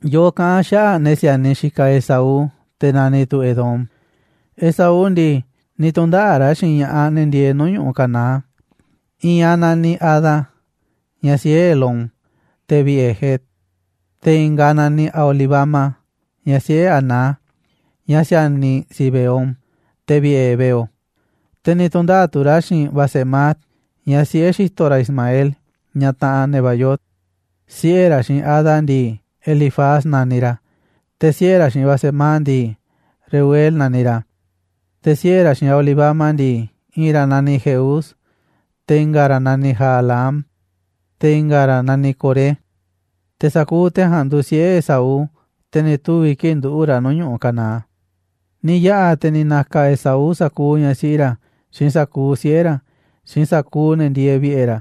Yoꞌoꞌ kaꞌán xaꞌa̱ꞌ ne̱ si̱a̱niꞌ xikaꞌ Esaú, te̱ naniꞌ tu̱ Edom. Esaú ndii, ni̱ tu̱ndaꞌa̱ꞌ ra̱ xiinꞌ ña̱ꞌaꞌ ne̱ ndieeꞌ nuu̱ꞌ ñu̱ꞌuꞌ Canaán, i̱i̱n aꞌ naniꞌ Ada, ñaꞌ siꞌe̱ Elón, te̱ vi̱ꞌe̱ het, te̱ i̱nga̱ aꞌ naniꞌ Aholibama, ñaꞌ siꞌe̱ Aná, ñaꞌ si̱a̱niꞌ Zibeón, te̱ vi̱ꞌe̱ heveo. Te̱ ni̱ tu̱ndaꞌa̱ꞌ tu̱ ra̱ xiinꞌ Basemat, ñaꞌ siꞌe̱ xi̱to̱ ra̱ Ismael, ñaꞌ taꞌanꞌ Nebaiot. Siꞌe̱ ra̱ xiinꞌ Ada ndii, Elifaz naniꞌ ra̱, te̱ siꞌe̱ ra̱ xiinꞌ Basemat ndii, Reuel naniꞌ ra̱. Te̱ siꞌe̱ ra̱ xiinꞌ Aholibama ndii, i̱i̱n ra̱ naniꞌ Jeús, te̱ i̱nga̱ ra̱ naniꞌ Jaalam, te̱ i̱nga̱ ra̱ naniꞌ Coré. Te̱ sa̱kuuꞌ te̱ ja̱a̱nꞌ nduuꞌ siꞌe̱ Esaú, te̱ ni̱ tuvi̱ kii̱ꞌ nduꞌu̱ꞌ ra̱ nuu̱ꞌ ñu̱ꞌuꞌ Canaán. Ni̱ yaꞌa̱ te̱ ni̱ na̱ka̱ Esaú sa̱kuuꞌ ñaꞌ siꞌi ra̱ xiinꞌ sa̱kuuꞌ siꞌe̱ ra̱, xiinꞌ sa̱kuuꞌ ne̱ ndieeꞌ vi̱ꞌe̱ ra̱,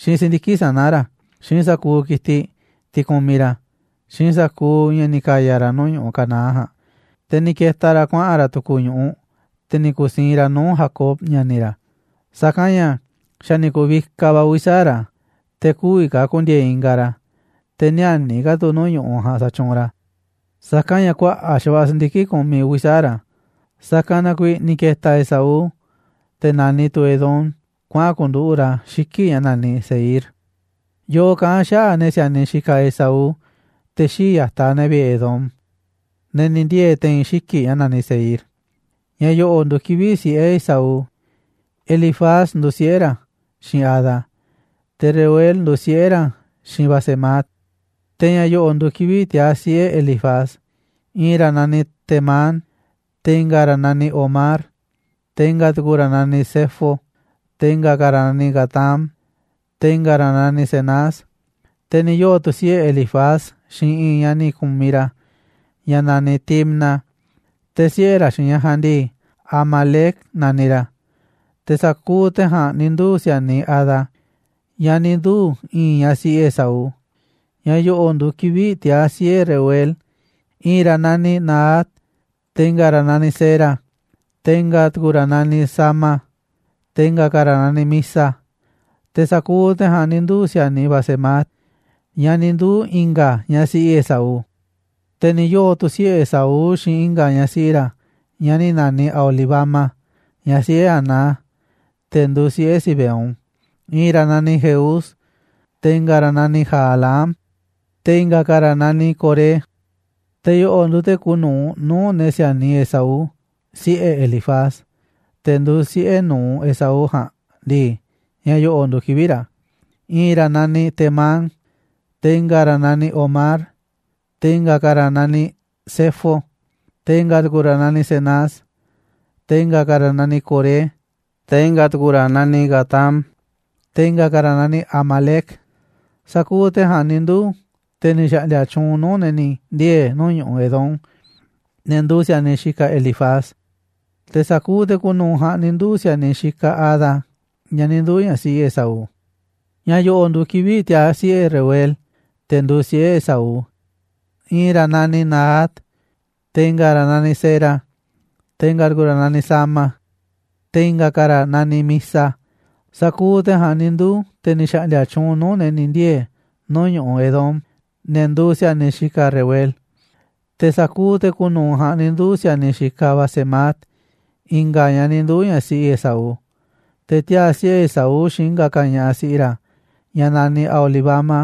xiinꞌ si̱ndiki̱ꞌ sana̱ ra̱, xiinꞌ sa̱kuuꞌ ki̱tiꞌ, tiꞌ kumiꞌ ra̱, xiinꞌ sa̱kuuꞌ ña̱ ni̱ ka̱ya̱ ra̱ nuu̱ꞌ ñu̱ꞌuꞌ Canaán ja̱a̱nꞌ, te̱ ni̱ ke̱ta̱ ra̱ kuaꞌa̱n ra̱ tu̱ku̱ ñu̱ꞌuꞌ, te̱ ni̱ ku̱siinꞌ ra̱ nuu̱ꞌ Jacob, ña̱ni̱ ra̱. Sa̱kanꞌ ña̱ xa̱ ni̱ ku̱vikaꞌ va̱ uvi̱ sa̱aꞌ ra̱, te̱ kü̱vi̱ ka̱ ku̱ndi̱e̱e̱ ingaꞌ ra̱, te̱ ni̱ä̱ni̱ ka̱ tu̱ nuu̱ꞌ ñu̱ꞌuꞌ ja̱a̱nꞌ sa̱tyuunꞌ ra̱, sa̱kanꞌ ña̱ kuaꞌa̱ꞌ xa̱va̱ꞌa̱ si̱ndiki̱ꞌ kumiꞌ uvi̱ sa̱aꞌ ra̱. Sa̱kanꞌ na kuiiꞌ ni̱ ke̱ta̱ Esaú, te̱ naniꞌ tu̱ Edom, kuaꞌa̱n ku̱nduꞌu̱ꞌ ra̱ xiki̱ꞌ ña̱ naniꞌ Seir. Yoꞌoꞌ kaꞌán a̱ xaꞌa̱ꞌ ne̱ si̱a̱niꞌ xikaꞌ Esaú, te̱ xii̱ꞌ ya̱taꞌ ne̱ vi̱ꞌe̱ Edom, ne̱ ni̱ ndiee̱ te̱i̱n xiki̱ꞌ ña̱ naniꞌ Seir. Ña̱ yo̱ꞌo̱ nduuꞌ kivi̱ꞌ siꞌe̱ Esaú: Elifaz nduuꞌ siꞌe̱ ra̱ xiinꞌ Ada, te̱ Reuel nduuꞌ siꞌe̱ ra̱ xiinꞌ Basemat. Te̱ ña̱ yo̱ꞌo̱ nduuꞌ kivi̱ꞌ tiaa̱ siꞌe̱ Elifaz: I̱i̱n ra̱ naniꞌ Temán, te̱ i̱nga̱ ra̱ naniꞌ Omar, te̱ i̱nga̱ tu̱ku̱ ra̱ naniꞌ Zefo, te̱ i̱nga̱ ka̱ ra̱ naniꞌ Gatám, te̱ i̱nga̱ ra̱ naniꞌ Cenaz. Te̱ ni̱ yoo̱ tu̱ siꞌe̱ Elifaz xiinꞌ i̱i̱n ñaꞌ ni̱ ku̱miꞌ ra̱, ñaꞌ naniꞌ Timna, te̱ siꞌe̱ ra̱ xiinꞌ ñaꞌ ja̱a̱nꞌ ndii, Amalec naniꞌ ra̱. Te̱ sa̱kuuꞌ te̱ ja̱a̱nꞌ ni̱ nduu̱ si̱a̱niꞌ Ada, ñaꞌ ni̱ nduu̱ i̱i̱n ñaꞌ siꞌi Esaú. Ña̱ yo̱ꞌo̱ nduuꞌ kivi̱ꞌ tiaa̱ siꞌe̱ Reuel: I̱i̱n ra̱ naniꞌ Nahat, te̱ i̱nga̱ ra̱ naniꞌ Zera, te̱ i̱nga̱ tu̱ku̱ ra̱ naniꞌ Sama, te̱ i̱nga̱ ka̱ ra̱ naniꞌ Miza. Te̱ sa̱kuuꞌ te̱ ja̱a̱nꞌ ni̱ nduu̱ si̱a̱niꞌ Basemat, ñaꞌ ni̱ nduu̱ i̱nga̱ ñaꞌ siꞌi Esaú. Te̱ ni̱ yoo̱ tu̱ siꞌe̱ Esaú xiinꞌ i̱nga̱ ñaꞌ siꞌi ra̱, ñaꞌ ni̱ naniꞌ Aholibama, ñaꞌ siꞌe̱ Aná, te̱ nduuꞌ siꞌe̱ Zibeón. I̱i̱n ra̱ naniꞌ Jeús, te̱ i̱nga̱ ra̱ naniꞌ Jalaam, te̱ i̱nga̱ ka̱ ra̱ naniꞌ Coré. Te̱ yo̱ꞌo̱ nduuꞌ te̱ kuuꞌ nu̱uꞌ nuu̱ꞌ ne̱ si̱a̱niꞌ Esaú. Siꞌe̱ Elifaz, te̱ nduuꞌ siꞌe̱ nu̱uꞌ Esaú ja̱a̱nꞌ ndii, ña̱ yo̱ꞌo̱ nduuꞌ kivi̱ꞌ ra̱: I̱i̱n ra̱ na̱niꞌ Temán, te̱ i̱nga̱ ra̱ na̱niꞌ Omar, te̱ i̱nga̱ ka̱ ra̱ naniꞌ Zefo, te̱ i̱nga̱ tu̱ku̱ ra̱ na̱niꞌ Cenaz, te̱ i̱nga̱ ka̱ ra̱ naniꞌ Coré, te̱ i̱nga̱ tu̱ku̱ ra̱ naniꞌ Gatám, te̱ i̱nga̱ ka̱ ra̱ naniꞌ Amalec. Sa̱kuuꞌ te̱ ja̱a̱nꞌ ni̱ nduu̱ te̱ ni̱ xa̱ꞌndi̱a̱ tyuunꞌ nuu̱ꞌ ne̱ ni̱ ndiee̱ nuu̱ꞌ ñu̱ꞌuꞌ Edom, ne̱ nduuꞌ si̱a̱niꞌ xikaꞌ Elifaz. Te̱ sa̱kuuꞌ te̱ kuuꞌ nu̱uꞌ ja̱a̱nꞌ ni̱ nduu̱ꞌ si̱a̱niꞌ xikaꞌ Ada, ñaꞌ ni̱ nduu̱ ñaꞌ siꞌi Esaú. Ña̱ yo̱ꞌo̱ nduuꞌ kivi̱ꞌ tiaa̱ siꞌe̱ Reuel, te̱ nduuꞌ siꞌe̱ Esaú: I̱i̱n ra̱ naniꞌ Nahat, te̱ i̱nga̱ ra̱ naniꞌ Zera, te̱ i̱nga̱ tu̱ku̱ ra̱ naniꞌ Sama, te̱ i̱nga̱ ka̱ ra̱ naniꞌ Miza. Sa̱kuuꞌ te̱ ja̱a̱nꞌ ni̱ nduu̱ te̱ ni̱ xa̱ꞌndi̱a̱ tyuunꞌ nuu̱ꞌ ne̱ ni̱ ndiee̱ nuu̱ꞌ ñu̱ꞌuꞌ Edom, ne̱ nduuꞌ si̱a̱niꞌ xikaꞌ Reuel. Te̱ sa̱kuuꞌ te̱ kuuꞌ nu̱uꞌ ja̱a̱nꞌ ni̱ nduu̱ꞌ si̱a̱niꞌ xikaꞌ Basemat, i̱nga̱ ñaꞌ ni̱ nduu̱ ñaꞌ siꞌi Esaú. Te̱ tiaa̱ siꞌe̱ Esaú xiinꞌ i̱nga̱ ka̱ ñaꞌ siꞌi ra̱, ñaꞌ naniꞌ Aholibama,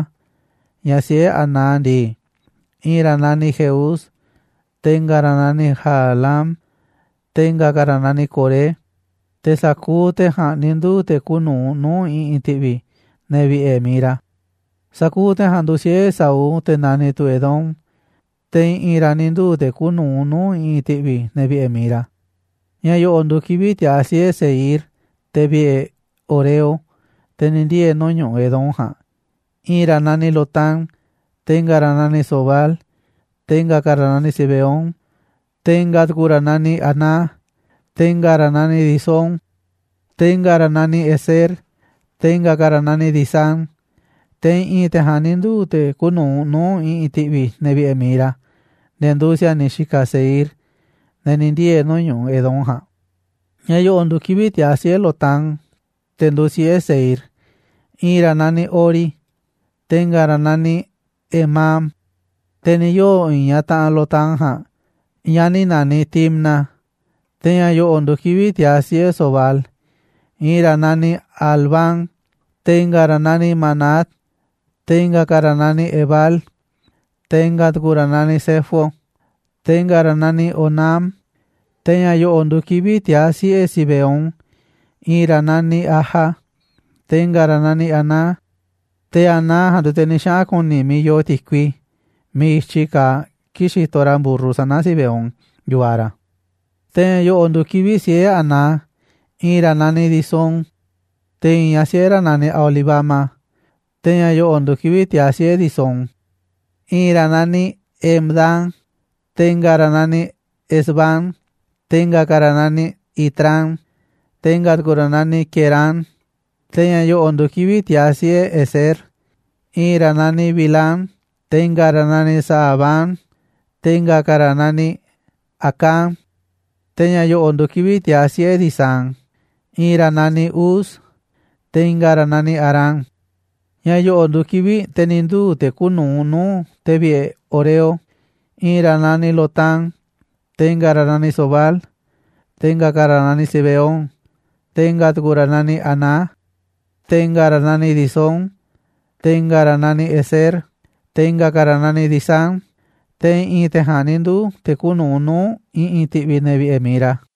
ñaꞌ siꞌe̱ Aná ndii: I̱i̱n ra̱ naniꞌ Jeús, te̱ i̱nga̱ ra̱ naniꞌ Jaalam, te̱ i̱nga̱ ka̱ ra̱ naniꞌ Coré. Te̱ sa̱kuuꞌ te̱ ja̱a̱nꞌ ni̱ nduu̱ꞌ te̱ kuuꞌ nu̱uꞌ nuu̱ꞌ i̱ꞌi̱n ti̱ꞌvi̱ ne̱ vi̱ꞌe̱ mi̱iꞌ ra̱. Sa̱kuuꞌ te̱ ja̱a̱nꞌ nduuꞌ siꞌe̱ Esaú, te̱ naniꞌ tu̱ Edom, te̱ i̱ꞌi̱n ra̱ ni̱ nduu̱ te̱ kuuꞌ nu̱uꞌ nuu̱ꞌ i̱ꞌi̱n ti̱ꞌvi̱ ne̱ vi̱ꞌe̱ mi̱iꞌ ra̱. Ña̱ yo̱ꞌo̱ nduuꞌ kivi̱ꞌ tiaa̱ siꞌe̱ Seir, te̱ vi̱ꞌe̱ horeo, te̱ ni̱ ndiee̱ nuu̱ꞌ ñu̱ꞌuꞌ Edom ja̱a̱nꞌ. I̱i̱n ra̱ naniꞌ Lotán, te̱ i̱nga̱ ra̱ naniꞌ Sobal, te̱ i̱nga̱ ka̱ ra̱ naniꞌ Zibeón, te̱ i̱nga̱ tu̱ku̱ ra̱ na̱niꞌ Aná, te̱ i̱nga̱ ra̱ naniꞌ Disón, te̱ i̱nga̱ ra̱ naniꞌ Ezer, te̱ i̱nga̱ ka̱ ra̱ naniꞌ Disán. Te̱ i̱ꞌi̱n te̱ ja̱a̱nꞌ ni̱ nduu̱ te̱ kuuꞌ nu̱uꞌ nuu̱ꞌ i̱ꞌi̱n ti̱ꞌvi̱ ne̱ vi̱ꞌe̱ mi̱iꞌ ra̱, ne̱ nduuꞌ si̱a̱niꞌ xikaꞌ Seir, ne̱ ni̱ ndiee̱ nuu̱ꞌ ñu̱ꞌuꞌ Edom ja̱a̱nꞌ. Ña̱ yo̱ꞌo̱ nduuꞌ kivi̱ꞌ tiaa̱ siꞌe̱ Lotán, te̱ nduuꞌ siꞌe̱ Seir: I̱i̱n ra̱ naniꞌ Hori, te̱ i̱nga̱ ra̱ naniꞌ Hemam. Te̱ ni̱ yoo̱ i̱i̱n ñaꞌ taꞌanꞌ Lotán ja̱a̱nꞌ, ñaꞌ ni̱ naniꞌ Timna. Te̱ ña̱ yo̱ꞌo̱ nduuꞌ kivi̱ꞌ tiaa̱ siꞌe̱ Sobal: I̱i̱n ra̱ naniꞌ Alván, te̱ i̱nga̱ ra̱ naniꞌ Manahat, te̱ i̱nga̱ ka̱ ra̱ naniꞌ Ebal, te̱ i̱nga̱ tu̱ku̱ ra̱ naniꞌ Sefo, te̱ i̱nga̱ ra̱ naniꞌ Onam. Te̱ ña̱ yo̱ꞌo̱ nduuꞌ kivi̱ꞌ tiaa̱ siꞌe̱ Zibeón: I̱i̱n ra̱ naniꞌ Aja, te̱ i̱nga̱ ra̱ naniꞌ Aná, te̱ Aná ja̱a̱nꞌ nduuꞌ te̱ ni̱ xaꞌa̱n ku̱ni̱ miiꞌ yoo ti̱kui miiꞌ i̱tyi kaaꞌ kii̱ꞌ xitoꞌ ra̱ mburru sana̱ Zibeón, yu̱vaꞌ ra̱. Te̱ ña̱ yo̱ꞌo̱ nduuꞌ kivi̱ꞌ siꞌe̱ Aná: I̱i̱n ra̱ naniꞌ Disón, te̱ i̱i̱n ñaꞌ siꞌe̱ ra̱ naniꞌ Aholibama. Te̱ ña̱ yo̱ꞌo̱ nduuꞌ kivi̱ꞌ tiaa̱ siꞌe̱ Disón: I̱i̱n ra̱ naniꞌ Hemdán, te̱ i̱nga̱ ra̱ naniꞌ Esbán, te̱ i̱nga̱ ka̱ ra̱ naniꞌ Itrán, te̱ i̱nga̱ tu̱ku̱ ra̱ naniꞌ Querán. Te̱ ña̱ yo̱ꞌo̱ nduuꞌ kivi̱ꞌ tiaa̱ siꞌe̱ Ezer: I̱i̱n ra̱ naniꞌ Bilhán, te̱ i̱nga̱ ra̱ naniꞌ Zaaván, te̱ i̱nga̱ ka̱ ra̱ naniꞌ Acán. Te̱ ña̱ yo̱ꞌo̱ nduuꞌ kivi̱ꞌ tiaa̱ siꞌe̱ Disán: I̱i̱n ra̱ naniꞌ Uz, te̱ i̱nga̱ ra̱ naniꞌ Arán. Ña̱ yo̱ꞌo̱ nduuꞌ kivi̱ꞌ te̱ ni̱ nduu̱ te̱ kuuꞌ nu̱uꞌ nuu̱ꞌ te̱ vi̱ꞌe̱ horeo: I̱i̱n ra̱ naniꞌ Lotán, te̱ i̱nga̱ ra̱ naniꞌ Sobal, te̱ i̱nga̱ ka̱ ra̱ naniꞌ Zibeón, te̱ i̱nga̱ tu̱ku̱ ra̱ naniꞌ Aná, te̱ i̱nga̱ ra̱ naniꞌ Disón, te̱ i̱nga̱ ra̱ naniꞌ Ezer, te̱ i̱nga̱ ka̱ ra̱ naniꞌ Disán. Te̱ i̱ꞌi̱n te̱ ja̱a̱nꞌ ni̱ nduu̱ te̱ kuuꞌ nu̱uꞌ nuu̱ꞌ i̱ꞌi̱n ti̱ꞌvi̱ ne̱ vi̱ꞌe̱ mi̱iꞌ ra̱.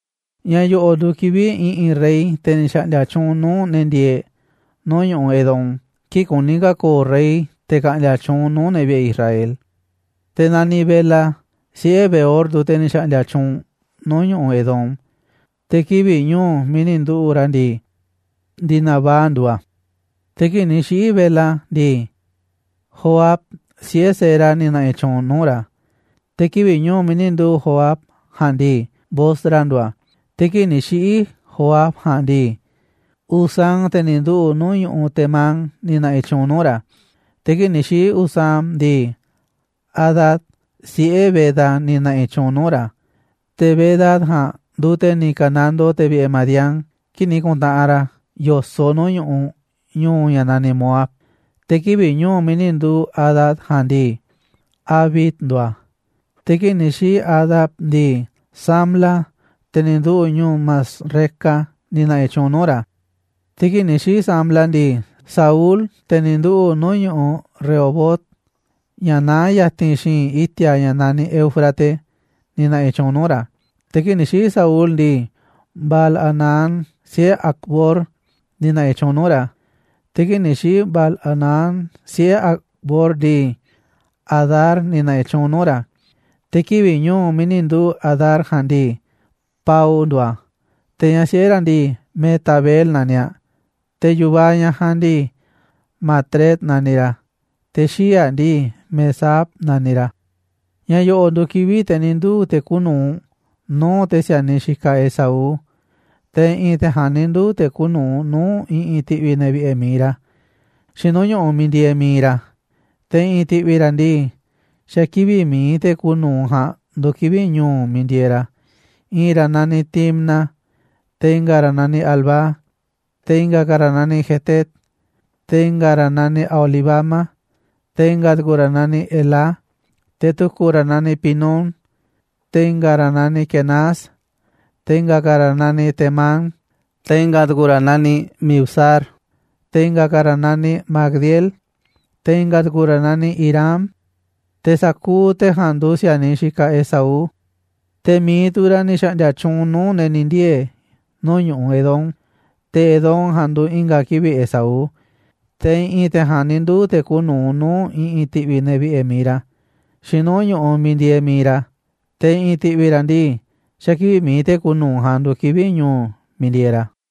Ña̱ yo̱ꞌo̱ nduuꞌ kivi̱ꞌ i̱ꞌi̱n rey, te̱ ni̱ xa̱ꞌndi̱a̱ tyuunꞌ nuu̱ꞌ ne̱ ndieeꞌ nuu̱ꞌ ñu̱ꞌuꞌ Edom kii̱ꞌ kuní ka̱ ko̱o̱ rey, te̱ ka̱ꞌndi̱a̱ tyuunꞌ nuu̱ꞌ ne̱ vi̱ꞌe̱ Israel. Te̱ naniꞌ Bela, siꞌe̱ Beor, nduuꞌ te̱ ni̱ xa̱ꞌndi̱a̱ tyuunꞌ nuu̱ꞌ ñu̱ꞌuꞌ Edom, te̱ kivi̱ꞌ ñu̱u̱ miiꞌ ni̱ nduꞌu̱ꞌ ra̱ ndii, Dinabá nduuꞌ a̱. Te̱ kii̱ꞌ ni̱ xiꞌi̱ Bela ndii, Johab, siꞌe̱ Zera, ni̱ na̱ꞌi̱ tyuunꞌ nuu̱ꞌ ra̱, te̱ kivi̱ꞌ ñu̱u̱ miiꞌ ni̱ nduꞌu̱ꞌ Johab ja̱a̱nꞌ ndii, Bosra nduuꞌ a̱. Te̱ kii̱ꞌ ni̱ xiꞌi̱ Johab ja̱a̱nꞌ ndii, Husam, te̱ ni̱ nduꞌu̱ꞌ nuu̱ꞌ ñu̱ꞌuꞌ Temán, ni̱ na̱ꞌi̱ tyuunꞌ nuu̱ꞌ ra̱. Te̱ kii̱ꞌ ni̱ xiꞌi̱ Husam ndii, Hadad, siꞌe̱ Bedad, ni̱ na̱ꞌi̱ tyuunꞌ nuu̱ꞌ ra̱. Te̱ Bedad ja̱a̱nꞌ nduuꞌ te̱ ni̱ ka̱nandoo te̱ vi̱ꞌe̱ Madián kii̱ꞌ ni̱ ku̱ntaꞌanꞌ ra̱ yo̱soꞌ nuu̱ꞌ ñu̱ꞌuꞌ, ñu̱u̱ ña̱ naniꞌ Moab. Te̱ kivi̱ꞌ ñu̱u̱ miiꞌ ni̱ nduꞌu̱ꞌ Hadad ja̱a̱nꞌ ndii, Avit nduuꞌ a̱. Te̱ kii̱ꞌ ni̱ xiꞌi̱ Hadad ndii, Samla, te̱ ni̱ nduꞌu̱ꞌ ñu̱u̱ Masreca, ni̱ na̱ꞌi̱ tyuunꞌ nuu̱ꞌ ra̱. Te̱ kii̱ꞌ ni̱ xiꞌi̱ Samla ndii, Saúl, te̱ ni̱ nduꞌu̱ꞌ nuu̱ꞌ ñu̱ꞌuꞌ Rehobot, ña̱ naá ya̱ti̱n xi̱i̱nꞌ i̱ti̱a̱ ña̱ naniꞌ Éufrates, ni̱ na̱ꞌi̱ tyuunꞌ nuu̱ꞌ ra̱. Te̱ kii̱ꞌ ni̱ xiꞌi̱ Saúl ndii, Baal-hanán, siꞌe̱ Acbor, ni̱ na̱ꞌi̱ tyuunꞌ nuu̱ꞌ ra̱. Te̱ kii̱ꞌ ni̱ xiꞌi̱ Baal-hanán, siꞌe̱ Acbor ndii, Hadar ni̱ na̱ꞌi̱ tyuunꞌ nuu̱ꞌ ra̱. Te̱ kivi̱ꞌ ñu̱u̱ miiꞌ ni̱ nduꞌu̱ꞌ Hadar ja̱a̱nꞌ ndii, Pau nduuꞌ a̱. Te̱ ñaꞌ siꞌe̱ ra̱ ndii, Mehetabel naniꞌ aꞌ, te̱ yu̱vaꞌ ñaꞌ ja̱a̱nꞌ ndii, Matred naniꞌ ra̱, te̱ xii̱ꞌ aꞌ ndii, Mezaab naniꞌ ra̱. Ña̱ yo̱ꞌo̱ nduuꞌ kivi̱ꞌ te̱ ni̱ nduu̱ te̱ kuuꞌ nu̱uꞌ nuu̱ꞌ te̱ si̱a̱niꞌ xikaꞌ Esaú. Te̱ i̱ꞌi̱n te̱ ja̱a̱nꞌ ni̱ nduu̱ te̱ kuuꞌ nu̱uꞌ nuu̱ꞌ i̱ꞌi̱n ti̱ꞌvi̱ ne̱ vi̱ꞌe̱ mi̱iꞌ ra̱, xiinꞌ nuu̱ꞌ ñu̱ꞌuꞌ miiꞌ ndieeꞌ mi̱iꞌ ra̱, te̱ i̱ꞌi̱n ti̱ꞌvi̱ ra̱ ndii, xa̱ kivi̱ꞌ mi̱iꞌ te̱ kuuꞌ nu̱uꞌ ja̱a̱nꞌ nduuꞌ kivi̱ꞌ ñu̱u̱ miiꞌ ndieeꞌ ra̱. I̱i̱n ra̱ naniꞌ Timna, te̱ i̱nga̱ ra̱ naniꞌ Alvá, te̱ i̱nga̱ ka̱ ra̱ naniꞌ Jetet, te̱ i̱nga̱ ra̱ naniꞌ Aholibama, te̱ i̱nga̱ tu̱ku̱ ra̱ naniꞌ Elá, te̱ tu̱ku̱ ra̱ naniꞌ Pinón, te̱ i̱nga̱ ra̱ naniꞌ Quenaz, te̱ i̱nga̱ ka̱ ra̱ naniꞌ Temán, te̱ i̱nga̱ tu̱ku̱ ra̱ naniꞌ Mibzar, te̱ i̱nga̱ ka̱ ra̱ naniꞌ Magdiel, te̱ i̱nga̱ tu̱ku̱ ra̱ naniꞌ Irám. Te̱ sa̱kuuꞌ te̱ ja̱a̱nꞌ nduuꞌ si̱a̱niꞌ xikaꞌ Esaú. Te̱ mi̱iꞌ tu̱ ra̱ ni̱ xa̱ꞌndi̱a̱ tyuunꞌ nuu̱ꞌ ne̱ ni̱ ndiee̱ nuu̱ꞌ ñu̱ꞌuꞌ Edom, te̱ Edom ja̱a̱nꞌ nduuꞌ i̱nga̱ kivi̱ꞌ Esaú. Te̱ i̱ꞌi̱n te̱ ja̱a̱nꞌ ni̱ nduu̱ te̱ kuuꞌ nu̱uꞌ nuu̱ꞌ i̱ꞌi̱n ti̱ꞌvi̱ ne̱ vi̱ꞌe̱ mi̱iꞌ ra̱, xiinꞌ nuu̱ꞌ ñu̱ꞌuꞌ miiꞌ ndieeꞌ mi̱iꞌ ra̱, te̱ i̱ꞌi̱n ti̱ꞌvi̱ ra̱ ndii, xa̱ kivi̱ꞌ mi̱iꞌ te̱ kuuꞌ nu̱uꞌ ja̱a̱nꞌ nduuꞌ kivi̱ꞌ ñu̱u̱ miiꞌ ndieeꞌ ra̱.